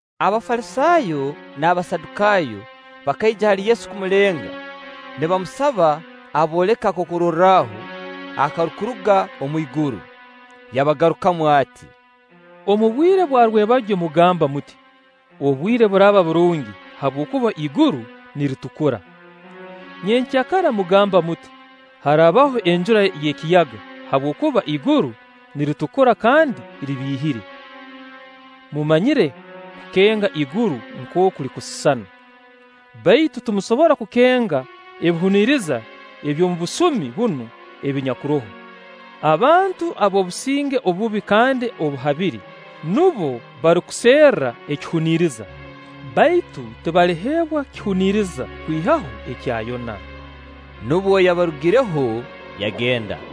Abafalisaayo n'Abasadukaayo bakaija hali Yesu kumulenga nibamusaba abooleke akokurorraho akarukuruga omwiguru. Yabagarukamu ati: “Omu bwire bwa rwebagyo mugamba muti: ‘Obwire buraaba burungi; habwokuba iguru niritukura.’ Nyenkya kara mugamba muti: ‘Harabaho enjura y'ekiyaga, habwokuba iguru niritukura kandi libiihire.’ Mumanyire kukenga iguru nkooku lirukusisana, baitu timusobora kukenga ebihuniriza eby'obusumi bunu obunyakuroho. Abantu ab'obusinge obubi kandi obuhabire, nubo barukuserra ekihuniriza; baitu tibaliheebwa kihuniriza kwihaho kya Yona.” Nubwo yabarugireho, yagenda.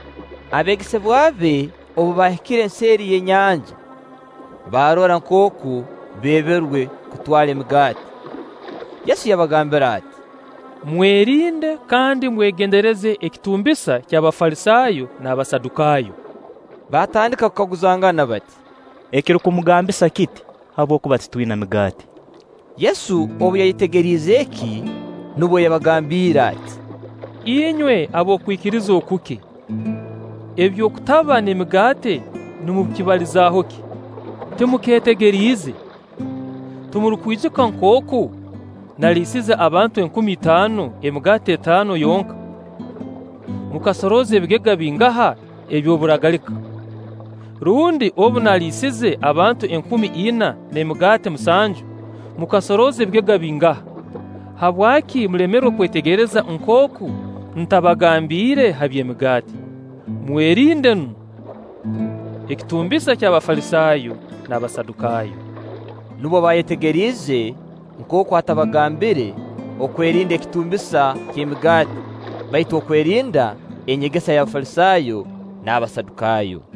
Abeegesebwa be obu baahikire nseeri y'enyanja, baarora nkooku beeberwe kutwara emigaati. Yesu yabagambira ati: “Mwerinde kandi mwegendereze ekitumbisa ky'Abafalisaayo n'Abasadukaayo.” Baatandika kukaguzangana bati: “Ekirukumugambisa kiti, habwokuba titwina migaati.” Yesu obu yayetegeriize eki, nubwo yabagambiire ati: “Inywe ab'okwikiriza okuke! Eby'okutaba n'emigaati nimukibalizaho ki? Timukeetegeriize? Timurukwijuka nkooku naliisize abantu enkumi itaano emigaati etaano yonka? Mukasorooza ebigega bingaha eby'oburagalika? Rundi obu naaliisize abantu enkumi ina n'emigaati musanju, mukasorooza ebigega bingaha? Habwaki mulemerwe kwetegereza nkooku ntabagambire ha by'emigaati? Mwerinde nu ekitumbisa ky'Abafalisaayo n'Abasadukaayo.” Nubwo baayetegeriize nkooku atabagambire okwerinda ekitumbisa ky'Emigaati, baitu okwerinda enyegesa y'Abafalisaayo n'Abasadukaayo.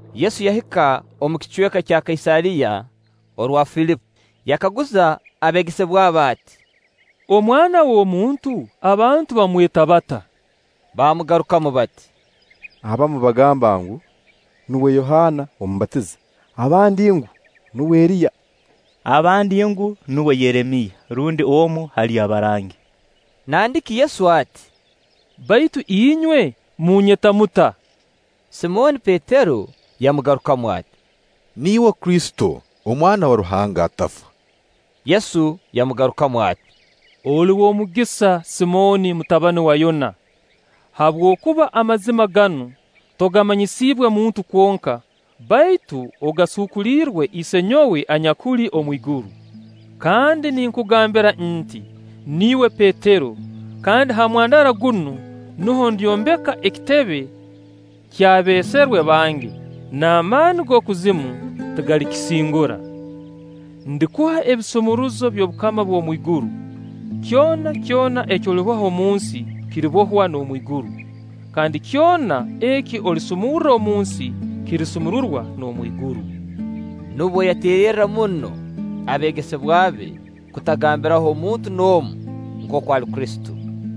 Yesu yahika omu kicweka kya Kaisaariya orwa Filipi, yakaguza abeegesebwa be ati: “Omwana w'omuntu abantu bamweta bata?” Baamugarukamu bati: “Abamu bagamba ngu: Nuwe Yohaana Omubatiza; abandi ngu: Nuwe Eriya; abandi ngu: Nuwe Yeremiya rundi omu hali abarangi.” Nandiki Yesu ati: “Baitu inywe munyeta muta?” Simooni Petero yamugarukamu ati: “Niiwe Kristo, Omwana wa Ruhanga Atafa.” Yesu yamugarukamu ati: “Oli w'omugisa Simooni, mutabani wa Yona, habwokuba amazima ganu togamanyisiibwe muntu kwonka, baitu ogasuukuliirwe Isenyowe anyakuli omu iguru. Kandi ninkugambira nti: Niiwe Petero, kandi ha mwandara gunu nuho ndyombeka ekitebe ky'abeeserwe bange, n'amaani g'okuzima tigalikisingura. Ndikuha ebisumuruzo by'obukama bw'omu iguru. Kyona kyona eki oliboha omu nsi, kiribohwa n'omu iguru; kandi kyona eki olisumurra omu nsi, kirisumururwa n'omu iguru.” Nubwo yateererra muno abeegesebwa be kutagambiraho muntu n'omu nkooku ali Kristo.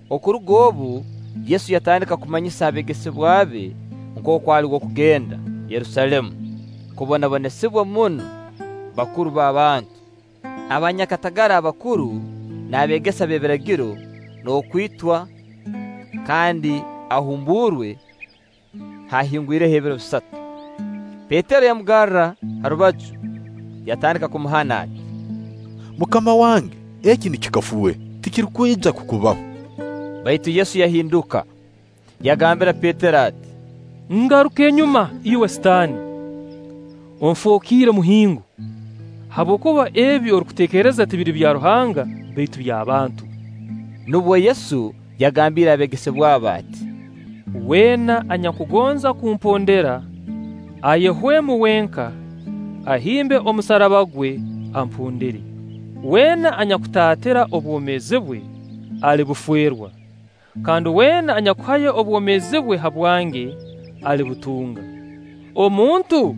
Okuruga obu Yesu yatandika kumanyisa abeegesebwa be nkooku ali w'okugenda Yerusaalemu kubonabonesibwa muno bakuru b'abantu, abanyakatagara abakuru, n'abeegesa b'ebiragiro; n'okwitwa kandi ahumbuurwe haahingwireho ebiro bisatu. Petero yamugarra ha rubaju, yatandika kumuhana ati: “MUKAMA wange, eki nikikafuuhe! Tikirukwija kukubaho.” Baitu Yesu yahinduka, yagambira Petero ati: “Ngaruka enyuma iwe Sitaani! Onfookiire muhingo, habwokuba ebi orukuteekereza tibiri bya Ruhanga, baitu by'abantu.” Nubwo Yesu yagambiire abeegesebwa be ati: “Weena anyakugonza kumpondera, ayehwemu wenka, ahimbe omusaraba gwe, ampondere. Weena anyakutaatira obwomeezi bwe, alibufeerwa; kandi weena anyakuhayo obwomeezi bwe habwange, alibutunga. Omuntu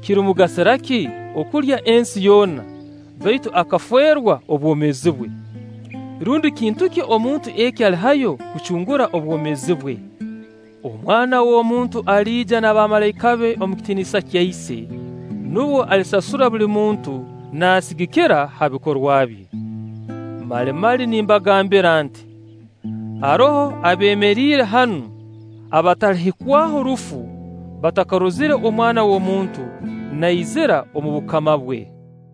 kirimugasira ki okulya ensi yoona, baitu akafeerwa obwomeezi bwe? Rundi kintu ki omuntu eki alihayo kucungura obwomeezi bwe? Omwana w'omuntu aliija n'abamalaika be omu kitiinisa kya Ise, nubwo alisasura buli muntu naasigikira ha bikorwa bye. Mali mali nimbagambira nti: Haroho abeemeriire hanu abatalihikwaho rufu batakarozire Omwana w'omuntu naizira omu bukama bwe.”